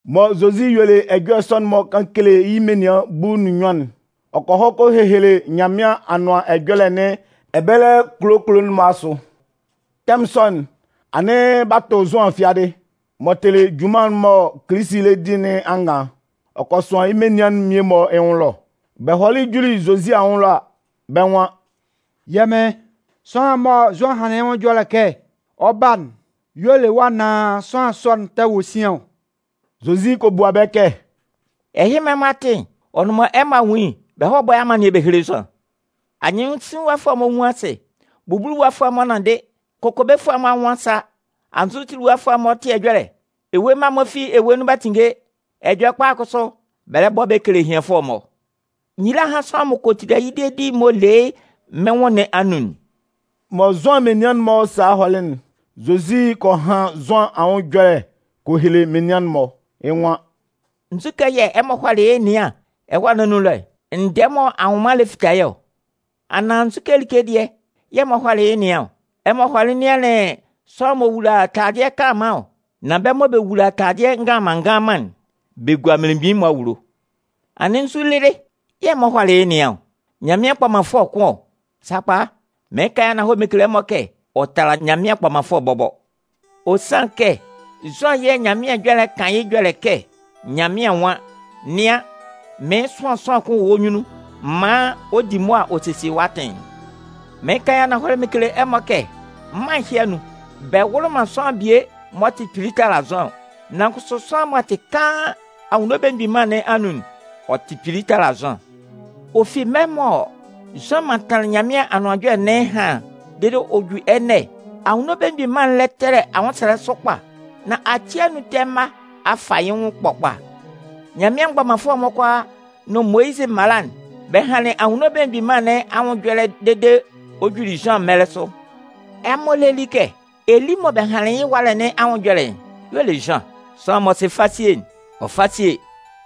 Mɔ Zozi yuelɩ ɛjɔlɛ sɔ'n-mɔ kan kele yɩ́ menian bulu nʋn nnyuan'n, ɔ kɔ hɔ kɔ hehele Nyanmɩan Anʋan Ɛjɔlɛ nɩn ɛbɛlɛ kulo kulo'n-mɔ asʋ. Tɛmʋn sɔ'n, anɩn b'a tʋ Zʋan fiadɩ. M'ɔ tɩlɩ junman'n mɔ Kilisi lɛ di nɩn angan'n, ɔ kɔ sʋan yɩ́ menian'n mmie-mɔ yɩ́ nwʋn ɛlɔ. Bɛ hɔlɩ juli Zozi anwʋn ɛlɔ a, bɛ́ nwan: “Yɛ́ Mɩn, sʋanlan'n mɔ Zʋan hanlɩn yɩ́ ɛjɔlɛ kɛ ɔ 'ba'n y'ɔ le wɔ́ anaan sʋanlan sɔ'n tɛ wɔ sian ɔ?” Zozi kɔ bua bɛ́ kɛ: “Ɛhɩ mɔ ɛmɔ a tɩ'n, ɔ nʋn mɔ ɛmɔ a nwun yɩ́'n, bɛ hɔ́ bɔ́ nun amannɩɛ bɛ héle Zʋan. Anyɩnsinlinwafʋɛ'n-mɔ nwun asɩ. Bubuluwafʋɛ'n-mɔ nanndɩ. Kokobefʋɛ'n-mɔ anwʋn a sa. Anzʋtiliwafʋɛ'n-mɔ tɩ ɛjɔlɛ. Ewue mma'n-mɔ fi ewue nun b'a tinnge. Ɛjɔlɛkpa'n kʋsʋ, bɛ lɛ bɔ bɛ kele ehianfʋɛ'n-mɔ. Nyila hán sʋanlan m'ɔ kɔ tila yɩ́ dedi'n m'ɔ le yɩ́ mɩ́n nwʋn nɩn anun'n.” Mɔ Zʋan menian'n-mɔ salɩ hɔlɩ'n, Zozi kɔ han Zʋan anwʋn ɛjɔlɛ kɔ hele menian'n-mɔ. Yɩ́ nwan: “Nzukɛ yɛ̂ ɛmɔ hɔlɩ yɩ́ ɛnɩan ɛwâ nɩn anun ɛlɔ'n? Ndɛɛ mɔ anwʋnman'n lɛ fita yɩ́ ɔ? Anaan nzu like dɩɛ yɛ̂ ɛmɔ hɔlɩ yɩ́ ɛnɩan ɔ? Ɛmɔ hɔlɩ nɩanlɩn sʋanlan m'ɔ wula taladɩɛ kanlanman ɔ? Nan bɛ́ mɔ bɛ wula taladɩɛ nganlanman nganlanman'n, bɛ gua mmelemgbin'n-mɔ awulo. Anɩn nzu lɩlɩ yɛ̂ ɛmɔ hɔlɩ yɩ́ ɛnɩan'n? Nyanmɩan kpɔmanfʋɛ kʋn ɔ? Sakpa, mɩɩn kan mɩn kele ɛmɔ kɛ ɔ tala Nyanmɩan kpɔmanfʋɛ bɔbɔ. Ɔ sanlɩn kɛ Zʋan yɛ̂ Ɛhɛlɛ Ɛjɔlɛ'n kan yɩ́ ɛjɔlɛ kɛ Nyanmɩan nwan: Nɩan, mɩɩn sʋan sʋanlan kʋn wɔ́ nyunnun maan ɔ di mʋa ɔ sesie wɔ́ atɩn'n. “Mɩɩn kan yɩ́ ananhɔlɛ mɩn kele ɛmɔ kɛ mân ɛhɩ anun, bɛ wʋlɩ man sʋanlan bie m'ɔ tɩ kpili tala Zʋan ɔ. Nan kʋsʋ sʋanlan m'ɔ tɩ kaan Anwunno Belemgbin Mân nɩn anun'n, ɔ tɩ kpili tala Zʋan. Ɔ fi mɛlɛ mɔ Zʋan mantanlɩn Nyanmɩan Anʋan Ɛjɔlɛ nɩn ɛhan dede m'ɔ ju ɛnɛ'n, Anwunno Belemgbin Mân'n lɛ tɛlɛ anwʋnsɛlɛ sʋ kpa. Nan ati anun ɛtɛ mma'n-mɔ a fa yɩ́ nwʋn ɛkpɔ kpa. Nyanmɩan mgbɔmanfʋɛ'n-mɔ kʋalaa nʋn Moyizɩ mala'n, bɛ hanlɩn Anwunno Belemgbin Mân nɩn anwʋn ɛjɔlɛ dede ɔ juli Zʋan mɛlɛ sʋ. Ɛmɔ lé li kɛ Eli mɔ bɛ hanlɩn yɩ́ ɛwalɛ nɩn anwʋn ɛjɔlɛ'n y'ɔ le Zʋan. Sʋanlan m'ɔ sɩ fasie'n, ɔ fá sie!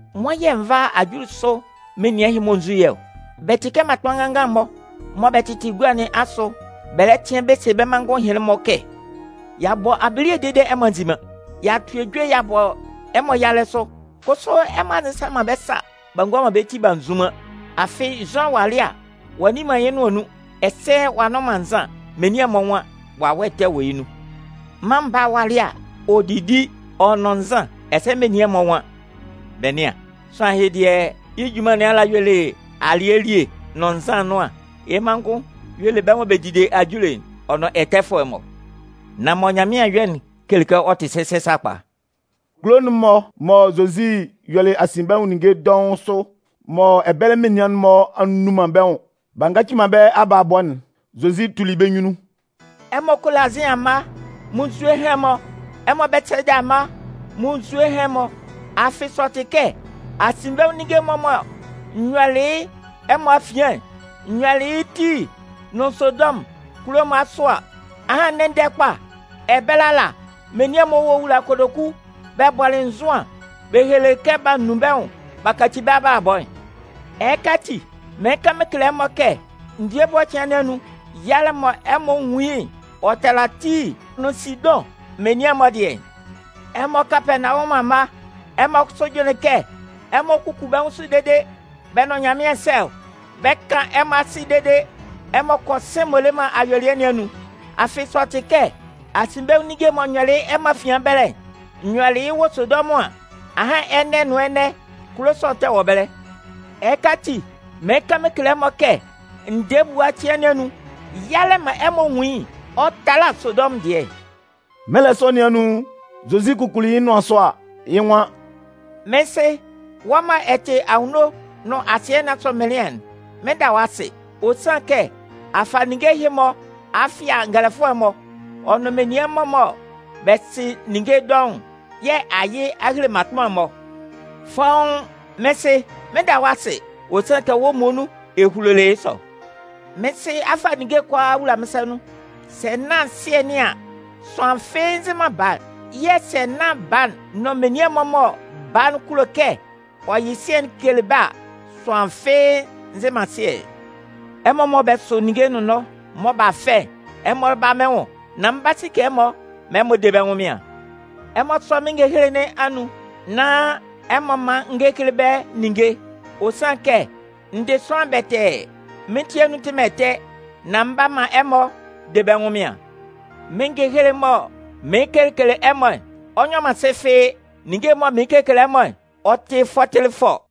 “Nwan yɛ̂ n vá ajulisʋ menian'n-mɔ n zú yɩ́ ɔ? Bɛ tɩ kɛ mmatʋnman nganngan-mɔ mɔ bɛ tɩtɩ gua nɩn asʋ bɛ lɛ tɩan bɛ se bɛ́ manngʋn ɛhɩnlɩn-mɔ kɛ: ‘Y'a bɔ abile dede ɛmɔ a nzi man. Y'a tʋ ejue y'a bɔ ɛmɔ yalɛ sʋ, kʋsʋ ɛmɔ a nzɩsa man bɛ́ sa b'a ngua man bɛ́ ti b'a nzun man.’ “Afɩ Zʋan walɩ a, ɔ'a nni man yɩ́ nʋan nun ɛsɛ ɔ'a nnʋn man nzan. Menian'n-mɔ nwan: ‘Wawɛ ɛtɛ wɔ yɩ́ nun.’ Mân Baa'n walɩ a, ɔ didi, ɔ nʋn nzan, ɛsɛ menian'n-mɔ nwan: ‘Bɛ nɩ́an, sʋanlan ɛhɩ dɩɛ, yɩ́ junman nɩn ala y'ɔ le alɩɛ elie nʋn nzan ɛnʋan. Yɩ́ manngʋn y'ɔ le bɛ́ mɔ bɛ dide ajule'n, ɔ nʋn ɛtɛfʋɛ'n-mɔ’. Nan mɔ Nyanmɩan a yɔ'n kele kɛ ɔ tɩ sɛsɛ sakpa.” Kulo'n-mɔ mɔ Zozi yɔlɩ asinbɛnwʋn ninnge dɔʋn sʋ, mɔ ɛbɛlɛ menian'n-mɔ a nnun man bɛ́ nwʋn b'a ngaci man bɛ́ abalabɔ'n, Zozi tuli bɛ́ nyunnun. “Ɛmɔ Kolazɩn amma, munnzue hán ɛmɔ! Ɛmɔ Bɛtɩsayida amma, munnzue hán ɛmɔ! Afɩ sɛ ɔ tɩ kɛ asinbɛnwʋn ninnge'n-mɔ mɔ n yɔlɩ yɩ́ ɛmɔ afian'n, n yɔlɩ yɩ́ Tii nʋn Sidʋn kulo'n-mɔ asʋ a, ahan ndɛ-ndɛ kpa ɛbɛlɛ menian'n-mɔ wulalɩ kotoku bɛ bɔlɩ nzʋan bɛ helelɩ kɛ b'a nun bɛ́ nwʋn b'a kaci bɛ́ abalabɔ'n. Ɛhɩka ati, mɩɩn kan mɩn kele ɛmɔ kɛ ndɛɛ ebua cɩan nɩn anun, yalɛ mɔ ɛmɔ 'nwun yɩ́'n, ɔ 'tala Tii nʋn Sidʋn menian'n-mɔ dɩɛ'n. Ɛmɔ Kapɛɛnawɔmʋn amma, ɛmɔ kʋsʋ jʋnlɩn kɛ ɛmɔ 'kuku bɛ́ nwʋn sʋ dede bɛ nʋn Nyanmɩan sɛ ɔ? Bɛ 'kan ɛmɔ asɩ dede ɛmɔ kɔ sɩ̂n m'ɔ le man ayuelɩɛ nɩn anun. Afɩ sɛ ɔ tɩ kɛ asinbɛnwʋn ninnge'n mɔ n yɔlɩ yɩ́ ɛmɔ afian ɛbɛlɛ'n, n yɔlɩ yɩ́ Sodɔmʋn an, ahan ɛnɛ nʋn ɛnɛ, kulo sɔ'n tɛ wɔ ɛbɛlɛ. Ɛhɩka ati, mɩɩn kan mɩn kele ɛmɔ kɛ ndɛɛ ebua cɩan nɩn anun, yalɛ mɔ ɛmɔ 'nwun yɩ́'n, ɔ 'tala Sodɔmʋn dɩɛ'n.” Mɛlɛ sɔ nɩn anun, Zozi kukuli yɩ́ nʋan sʋ a, yɩ́ nwan: “Mɩ́n Sɩ, wɔ́ mɔ ɛ tɩ anwunno nʋn asɩɛ nɩn asʋ Mɩnlɩan'n, mɩn 'da wɔ́ asɩ. Ɔ sanlɩn kɛ a fa ninnge ɛhɩ-mɔ a fɩa ngɛlɛfʋɛ'n-mɔ, ɔ nʋn menian'n-mɔ mɔ bɛ sɩ ninnge dɔʋn'n, yɛ̂ a yɩ a hele mmatʋnman'n-mɔ. Fɔ́ʋ́n, mɩ́n Sɩ, mɩn 'da wɔ́ asɩ, ɔ sanlɩn kɛ wɔ́ muonun ɛ hulolɩ yɩ́ sɔ. “Mɩ́n Sɩ a fa ninnge'n kʋalaa a wula mɩ́n sa nun. Sɛ nán Sɩɛ nɩn an, sʋanlan fɩ́ɩ́ nzɩ man Baa'n. Yɛ̂ sɛ nán Baa'n nʋn menian'n-mɔ mɔ Baa'n kulo kɛ ɔ yɩ Sɩɛ'n kele bɛ́ a, sʋanlan fɩ́ɩ́ nzɩ man Sɩɛ'n. “Ɛmɔ mɔ bɛ sʋ ninnge nʋnnɔɛ mɔ b'a fɛ'n, ɛmɔ bála mɩ́n nwʋn nán mɩn 'ba sike ɛmɔ maan bɛ de bɛ́ ɛnwʋnmɩan. Ɛmɔ sɔ́ mɩ́n ngehele nɩn anun nán ɛmɔ mán n gékele bɛ́ ninnge. Ɔ sanlɩn kɛ n dɩ sʋanlan bɛtɛɛ, mɩ́n ti anun tɩ man ɛtɛ, nán mɩn 'ba man ɛmɔ de bɛ́ ɛnwʋnmɩan. Mɩ́n ngehele'n mɔ mɩɩn kekele ɛmɔ'n, ɔ nyɔ man sɩ, ninnge'n mɔ mɩɩn kekele ɛmɔ'n, ɔ tɩ fɔtɩlɩfɔ”.